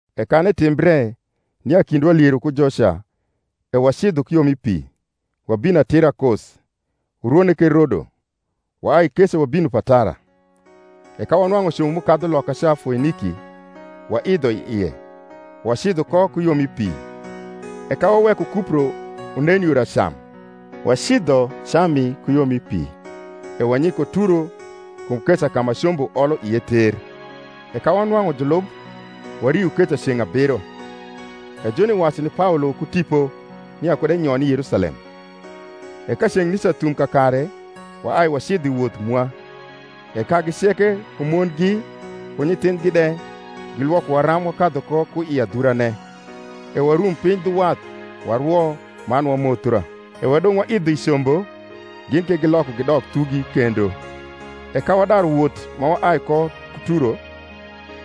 E kan etimbre nia kindwa liero ku joca e wacidho ku yo mi pi, wabino atira Kos, urwone ke Rodo, waai keca wabino Patara: e ka wanwang’u combo m’ukadhu lokaca Foiniki, waidho i ie, wacidho ko ku yo mi pi. E ka waweko Kupro unen yor acam, wacidho Cami ku yo mi pi, e wanyiko Turo; kum keca ka ma combo olo ie ter. E ka wanwang’u julub wario keca ceng’ abiro: e joni wacu ni Paolo ku Tipo, nia kud enyon i Yerusalem. E ka ceng’ nica thum kakare, waai wacidho i woth mwa; e kagi ceke ku mongi ku nyithindhgi de, gilwokowa ram wakadhu ko ku i adhurane: e warum piny dhu wath, warwo, man wamothia; e wadong’ waidho i combo, gin ke giloko gidok thugi kendo. E ka wadaru wot ma waai ko Turo,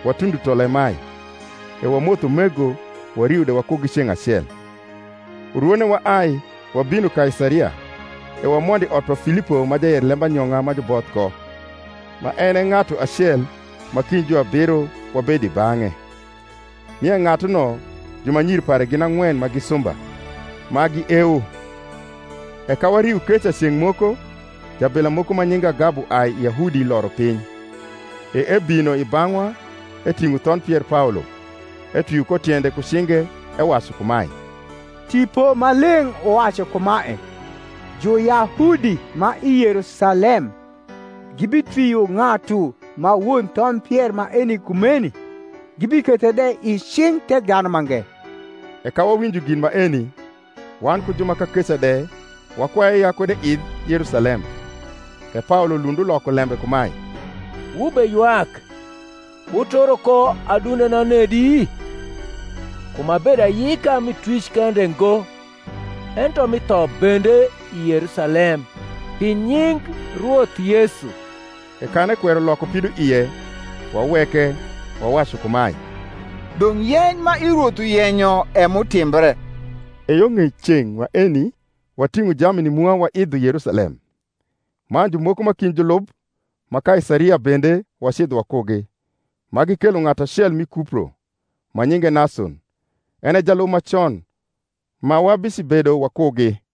watundo Tolemai: e wamotho umego, wario de wakugi ceng’ acel. Urwone waai, wabino Kaisaria: e wamondo i ot pa Filipo ma jayer lembayong’a ma juboth ko, ma en e ng’atu acel ma kind juabiro, wabedo i bang’e. Nie ng’atuno jumanyir pare gin ang’wen ma gi sumba, ma giewo. E ka wario keca ceng’ moko, jablia moko ma nyinge Agabo uai i Yahudi loro piny. E ebino i bang’wa, eting’o thondh pier Paolo, etwio ko tiende ku cinge, ewacu kumae, Tipo Maleng’ uwacu kumae, Juyahudi ma i Yerusalem gibitwio ng’atu ma won thondh pier maeni kumeni, gibikethe de i cing’ Thekdhanumange. E ka wawinjo gin maeni, wan ku ju ma kakeca de wakwaye ya kud eidh Yerusalem. E Paolo lund uloko lembe kumae, Wubeywak, wuturo ko adundena nedi? kum abedo ayika mi twic kende ngo, ento mi tho bende i Yerusalem pi nying Rwoth Yesu. E kan ekwero loko pidoie, waweke, wawacu kumae, Dong’ yeny ma i Rwoth uyenyo e m’utimbre. E yo ng’ei ceng’ maeni wating’o jamni mwa waidho Yerusalem. Man jumoko ma kind julub ma Kaisaria bende wacidho wakugi, ma gikelo ng’atu acel mi Kupro, ma nyinge Nason, en e jalub ma con, ma wabicibedo wakugi.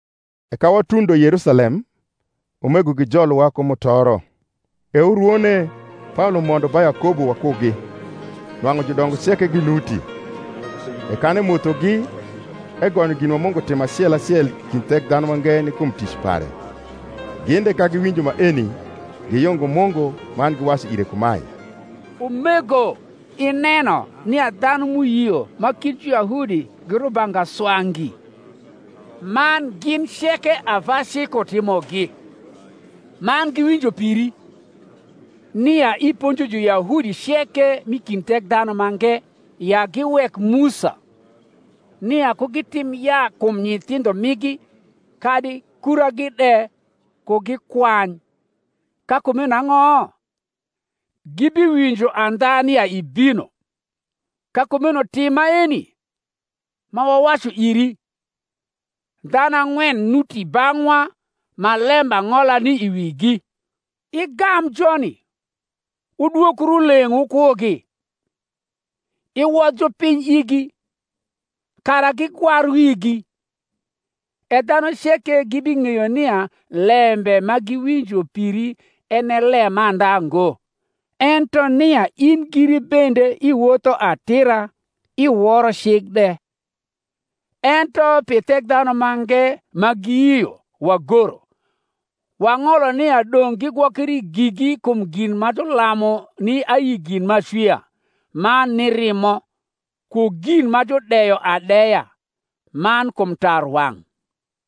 E ka watundo Yerusalem, umego gijolowa ku mutoro. E urwone Paolo mondo ba Yakobo wakugi; nwang’u judongo ceke ginuti. E kan emothogi, egonyo gin ma Mungu timo acel acel i kind Thekdhanumange ni kum tic pare. Gin de, ka giwinjo maeni, giyungo Mungu; man giwacu ire kumae, Umego, ineno nia dhanu m’uyio ma kind Juyahudi gi rubanga swa ngi; man gin ceke ava cik utimogi: man giwinjo piri, nia iponjo Juyahudi ceke m’i kind Thekdhanumange ya giwek Musa, nia ku gitim yaa kum nyithindho migi, kadi kuragi de ku gikwany. Ka kumeno ang’o? gibiwinjo andha nia ibino. Ka kumeno tim maeni ma wawacu iri: Dhanu ang’wen nuti bang’wa ma lembang’ola ni i wigi: igam joni, wudwokru leng’ wukugi, iwodh jupiny igi, kara gigwar wigi: e dhanu ceke gibing’eyo nia lembe ma giwinjo piri en e lemandha ngo; ento nia in giri bende iwotho atira, iworo cik de. Ento pi Thekdhanumange ma giyio, wagoro, wang’olo nia dong’ gigwokri gigi kum gin ma julamu ni ayi gin m’acwia, man ni rimo, ku gin ma judeyo adeya, man kum tarwang’.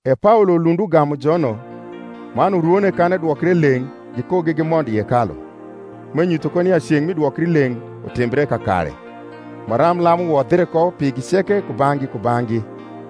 E Paolo lund ugamu jono, man urwone kan edwokre leng’ gikugi gimondo i hekalu, m’enyutho ko nia ceng’ mi dwokrileng’ utimbre kakare, maram lam uwodhre ko pigi ceke kubang’gi kubang’gi.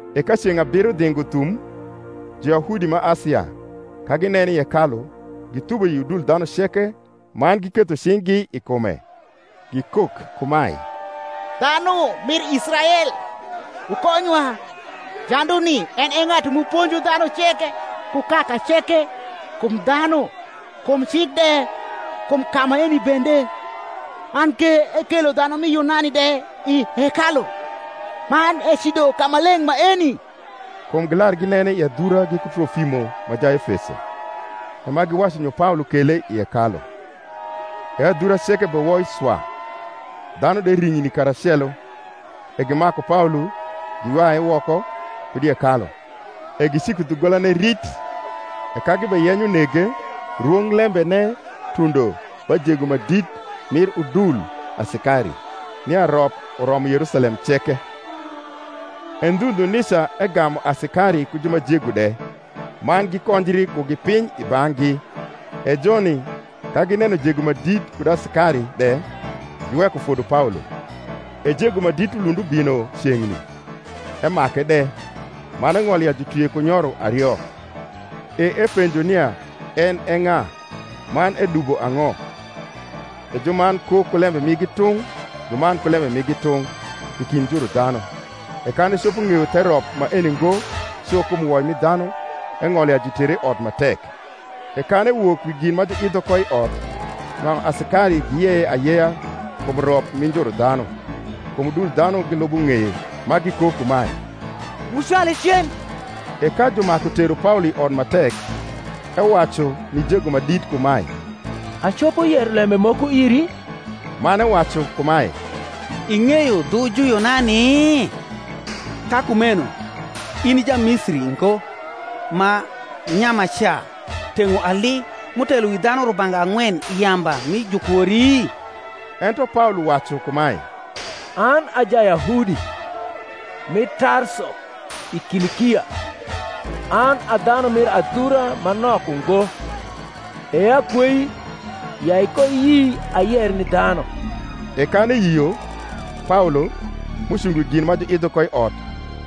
E ka ceng’ abiro dhingo thum, Juyahudi ma Asia, ka ginene i hekalu, githubo i udul dhanu ceke man giketho cing’gi i kume, gikok kumae, Dhanu mir Israel, wukonywa: Janduni en e ng’atu m’uponjo dhanu ceke ku kaka ceke kum dhanu, kum cik de kum ka maeni bende; man ke ekelo dhanu mi Yunani de i hekalu, man ecido kamaleng’ maeni. Kum gilar ginene i adhura giku Trolimo ma Jaefeso, e ma giwacu nyo Paolo kele i hekalu. E adhura ceke bewoi swa, dhanu de ring’ni karacelo; e gimaku Paolo, giywaye woko kud i hekalu: e giciko dhugolane rit. E ka gibeyenyo nege, rwonglembene tundo ba jego ma dit mir udul asikari, nia rop uromo Yerusalem ceke. E ndhu ndhu nica egamu asikari ku ju ma jego de, man gikonjri kugi piny i bang’gi: e joni, ka gineno jego ma dit kud asikari de, giweko fodo Paolo. E jego ma dit ulund ubino ceng’ni, emake de, man eng’olo ya jutwie ku nyoro ario; e epenjo nia en e ng’a, man edubo ang’o. E juman kok ku lembe migi tung’, juman ku lembe migi tung’, i kind njuru dhanu: e kan ecopo ng’eyo the rop maeni ngo cu kum woi mi dhanu, eng’olo ya jutere i ot ma tek. E kan ewok wi gin ma juidho ko i ot, nwang’u asikari giyeye ayeya kum rop mi njuru dhanu; kum udul dhanu gilubo ng’eye, ma gikok kumae, Wucwale cen. E ka jumaku tero Paolo i ot ma tek, ewacu ni jego ma dit kumae, Acopo yero lembe moko iri? Man ewacu kumae, Ing’eyo dhu Juyunani? Ka kumeno in i Jamisiri ngo ma nyamaca teng’o ali, m’utelo wi dhanu rubanga ang’wen i yamba mi Jukwori? Ento Paolo wacu kumae, An a Jayahudi, mi Tarso i Kilikia, an a dhanu mir adhura ma nok ungo: e akwei, ya ikoiyi ayer ni dhanu. E kan eyio, Paolo, m’ucungo wi gin ma juidho ko i ot,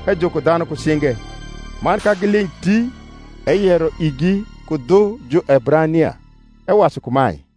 ejuko dhanu ku cinge; man ka giling’ ti, eyero igi ku dhu Juebrania, ewacu kumae,